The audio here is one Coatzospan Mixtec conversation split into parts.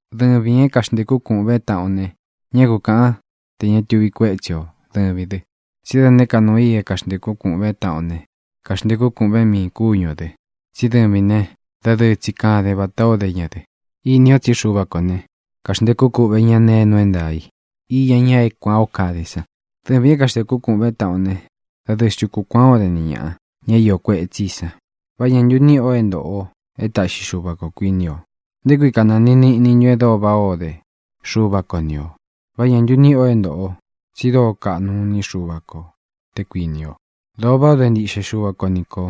Dɨvīn é kaxntēkún kūꞌvén taꞌan o ne, ñá ku kāꞌan te ña tuvi kuétsi o dɨvīn dɨ. Tsí da nēé ka nuu i é kaxntēkún kūꞌvén taꞌan o ne, kaxntēkún kūꞌvén miīn kúñu ō dɨ, tsí dɨvīn ne, dadɨɨ tsi kaden vatā ó de ñā dɨ. Ini o tsí Xuva kō ne, kaxntēkú kuꞌvē ñá nee é nuu é ntaā i iña ña é kuān ó kade san. Dɨvīn é kaxntēkún kūꞌvén taꞌan o ne, ¿dadɨɨ xntu ku kuān ó den ni ñāꞌa, ña é iō kuetsí i san? ¿Vá ñā ntu níꞌi o é ntōꞌo o é taꞌxi Xuva kō, kuiní o? ¿Nté kui kanantiin niꞌnin ntun e dóo váꞌa o de Xuva ko ni ō? ¿Vá ñā ntu níꞌi o é ntōꞌo o, tsi dóo kaꞌnu iní Xuva ko, te kuīni o? Dōo váꞌa o de ntiꞌxe Xuva ko ni kō.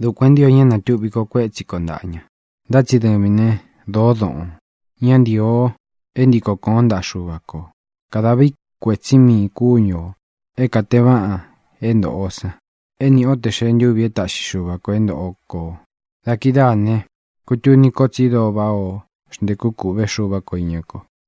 Dukuān é ntio ña é natūꞌvi ko kuétsi ko ntāꞌa ña. Ntá tsi dɨvīn né, dōó doꞌōn. Ñá ntīo o é ntiko kōón ntaꞌa Xuva kō. Kadāꞌvin kuétsi miīn kúñu ō é kāteen váꞌan é ntōꞌo o san é niꞌi o tē xee ntúvi é taꞌxi Xuva kō é ntoꞌo kō. Da kidáā ne, kutuni ko tsi dóo váꞌā o xntéku kūꞌvé Xuva ko īña kó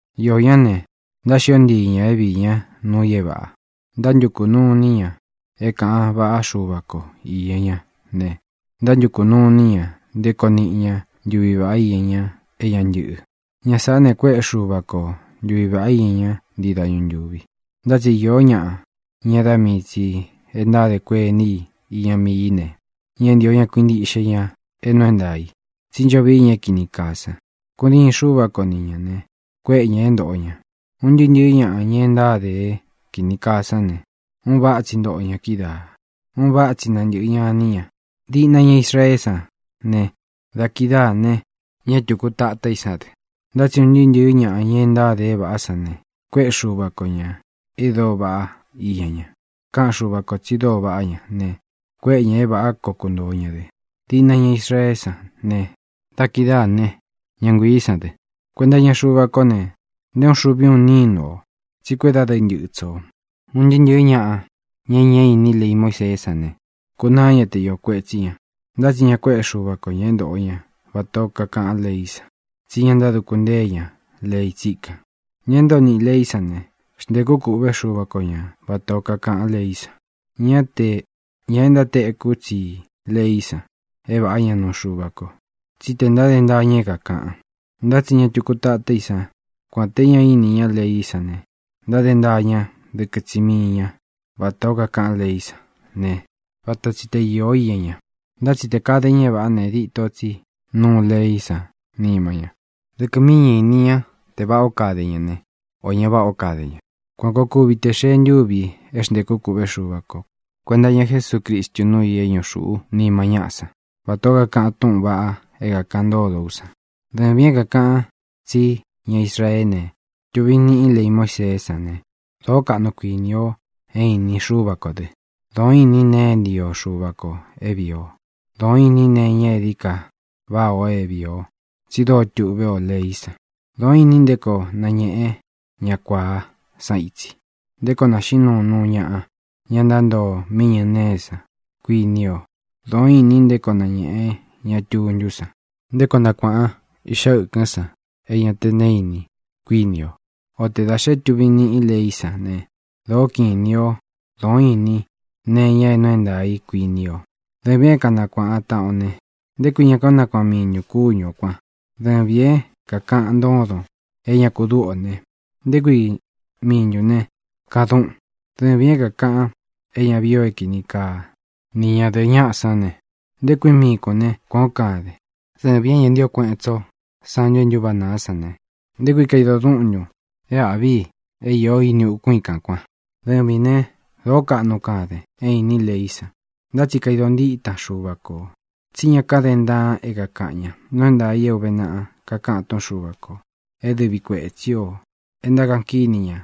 Iō ñá ne, ntáxio ntii ña é viī ñá nuu i é vāꞌa. Ntántukū nuu iní ña é kāꞌan váꞌa Xuva ko īña ña ne, ntántukū nuu iní ña nté koo niꞌi ñá ntuvi vāꞌá iña ña é ña ntɨꞌɨ. Ña sāꞌá ne, kuéꞌe Xuva ko ntuvi vāꞌá iña ña ntii dañu ntúvi. Ntá tsi iō ñáꞌa, ña é da mii tsī e ntádē kuení i iña mii í ne, ñá ntīo ña kuintiꞌxe ña é nuu é ntaā i, tsí ncho vii ña é kīni kaa san. Kudiin Xúva ko ni ñā ne, kuéꞌe ña ñā é ntōꞌo ña. Un ntɨɨ́ ntɨ̄ɨ́ ñaꞌa, ña e ntáde é kīni kaa sán ne, un váꞌa tsi ntoꞌo ña kídaā, un váꞌa tsi nantɨꞌɨ ña iní ña, diꞌna ña Israeé san ne, da kidáā ne, ña é tūku tatá i sán dɨ. Ntá tsi un ntɨɨ́ ntɨ̄ɨ́ ñaꞌa, ña e ntáde é vāꞌá san ne, kuéꞌe Xuva ko ñā e dóo vaꞌá iña ña. Káꞌan Xuva kō tsi dóo vaꞌá ña ne, kuéꞌe ña é vāꞌá koo kuntōo ña dɨ, diꞌna ña Israeé san ne, da kidáā né, ña nguiī sán dɨ. Kuenta iña Xuva kó ne, nté uun xuvi uun nínu ō, tsi kuédadɨɨ ntɨꞌɨ tsō. Un ntɨɨ́ ntɨ̄ɨ́ ñaꞌa, ña e ñá ini lei Muíseé san ne, kūnaá ña te iō kuetsí ña. Ntá tsi ña kuéꞌe Xuva ko ña é ntoꞌo ña vatā ó kakaꞌán leí san, tsí ña ntáduku ntée ña lei tsíkan. Ña é ntoo niꞌī leí san ne, xntēkú kūꞌvé Xuva ko ña vatā ó kakaꞌán leí san. Ñá tē ña e ntátekú tsi i leí san é vāꞌá ña nuu Xuva ko, tsí tē ntáde ntaa ña é kākaꞌan. Ntá tsi ña tuku tatá i sán, kuān té ña ini ñá leí san ne, ntáde ntaa ña dɨkɨ tsi mii ña vatā ó kakaꞌán leí san ne, vata tsi te īó lei íña ña. Ntá tsi tē kade ña é vāꞌá ne, dito tsí nuu leí san nima ña. Dɨkɨ míi ña īni te váꞌā ó kade ña ne, ō ña váꞌā ó de ña. Kuān koo kuvi te xee ntúvi é xntēkú kūꞌvé Xuva ko kuēnta iña Jesúcristu núu i é ñuꞌu xūꞌú nima ñáꞌa san, vatā ó kakaꞌan túꞌūn vaꞌa é kākaꞌan ntódo ú san. Dɨvīn é kākaꞌan tsí ña Israeén ne, tuvin niꞌin lei Muíseé san ne, dōó kaꞌnun kuini o é inin Xúva kō dɨ. Dōo ínin nee é ntio Xuva kō é vīi o. Dōo ínin nee iña é dií ka vaꞌa é vīi o, tsi dóo tuꞌvé o leí san. Dōo ínin nté koo nañēꞌen ñá kuāá san itsi, nté koo naxīꞌín nuun nuu ñaꞌa, ña ntántoo mí iñɨ nēé san, kuini o. Dōo ínin nté koo nañēꞌen ñá tuntú san, nté koo nakuāꞌan iꞌxa ɨkɨ́n san é ña te neé ini, kuíni o. O te dā xé tuvin niꞌin leí san ne, dōó kiꞌin inī ó, dōó inin nee iña é nuu é ntaā i, kuini o. Dɨvīn é kanakuāꞌan taꞌan o ne, ¿nté kui ña kánakuaꞌan miin ntūn kúñu ō kuan? Dɨvīn é kākaꞌan ntódon é ña ku dúꞌu ō ne, ¿nté kui miin ntūn ne, kadúꞌun? Dɨvīn é kākaꞌan é ña vií ō é kini kaa ni ñadɨ̄ꞌɨ ñáꞌa sán ne, ¿nté kui miin kūn né, kuān ó kaden? Dɨvīn é ña ntío kueꞌen tsí o santu e ntúváꞌa nāá san ne, ¿nté kui kaidon dúꞌun ntun é āꞌví i é īó ini ukún i kān kuan? Dɨvīn né, dōó kaꞌnu kaden é īnín leí san, ntá tsi kaidon ntítan Xuva kō, tsí ña káden ntaan é kākaꞌan ña. Nuu é ntaā i é ūve naꞌa kakaꞌan túꞌun Xuva kō é dɨvi kuētsí o e ntákaꞌan kíni ña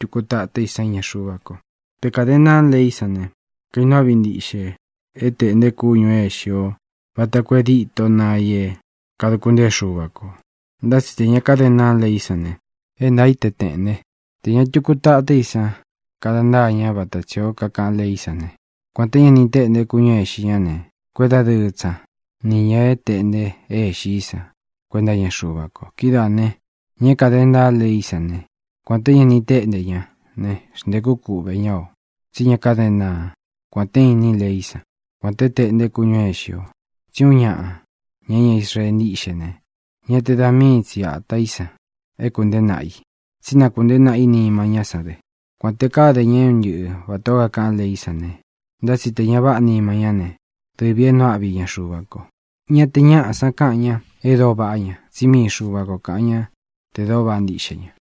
tuku tatá i san iña Xuva ko. Te kāden ntaan leí san ne, kainuu áꞌvi ntiꞌxe é tēꞌnte kúñū é īxi ó vata koo é dîtó naꞌa i é kādukun ntéen Xuva kō. Ntá tsi tē ña káden ntaan leí san ne, é ntaā í te tēꞌnte. Tē ña tuku tatá i san kada ntaá ña vata tsī ó kakaꞌán leí san ne, kuān té ña ni téꞌnte kúñū é ixi ñá ne, kuédadɨɨ tsi ña ni ñā é teꞌnte é ixi í san kuenta iña Xuva ko. Kidáā ne, ña é kāde ntaá leí san ne, kuān té ña ni téꞌnte ñá ne, xntēkú kuꞌvē ñá o, tsí ña káden ntaan, kuān te ínin leí san, kuān te téꞌnte kúñū é ixi o. Tsí uun ñaꞌa, ña é ña Israee ntíꞌxe ne, ñá te da mii tsi atā í san é kuntēé naꞌa i, tsí na kuntēé naꞌa i nima ñá san dɨ. Kuān te káde ña é un ntɨꞌɨ vatā ó kakaꞌán leí san ne, ntá tsi te vāꞌá nima ñá ne, dɨvī é nuu áꞌvi iña Xuva ko. Ña te ñáꞌa san káꞌan ña te dóo vaꞌá ña, tsí mii Xuva ko kāꞌan ñá tē dóo vaꞌá ntiꞌxe ña.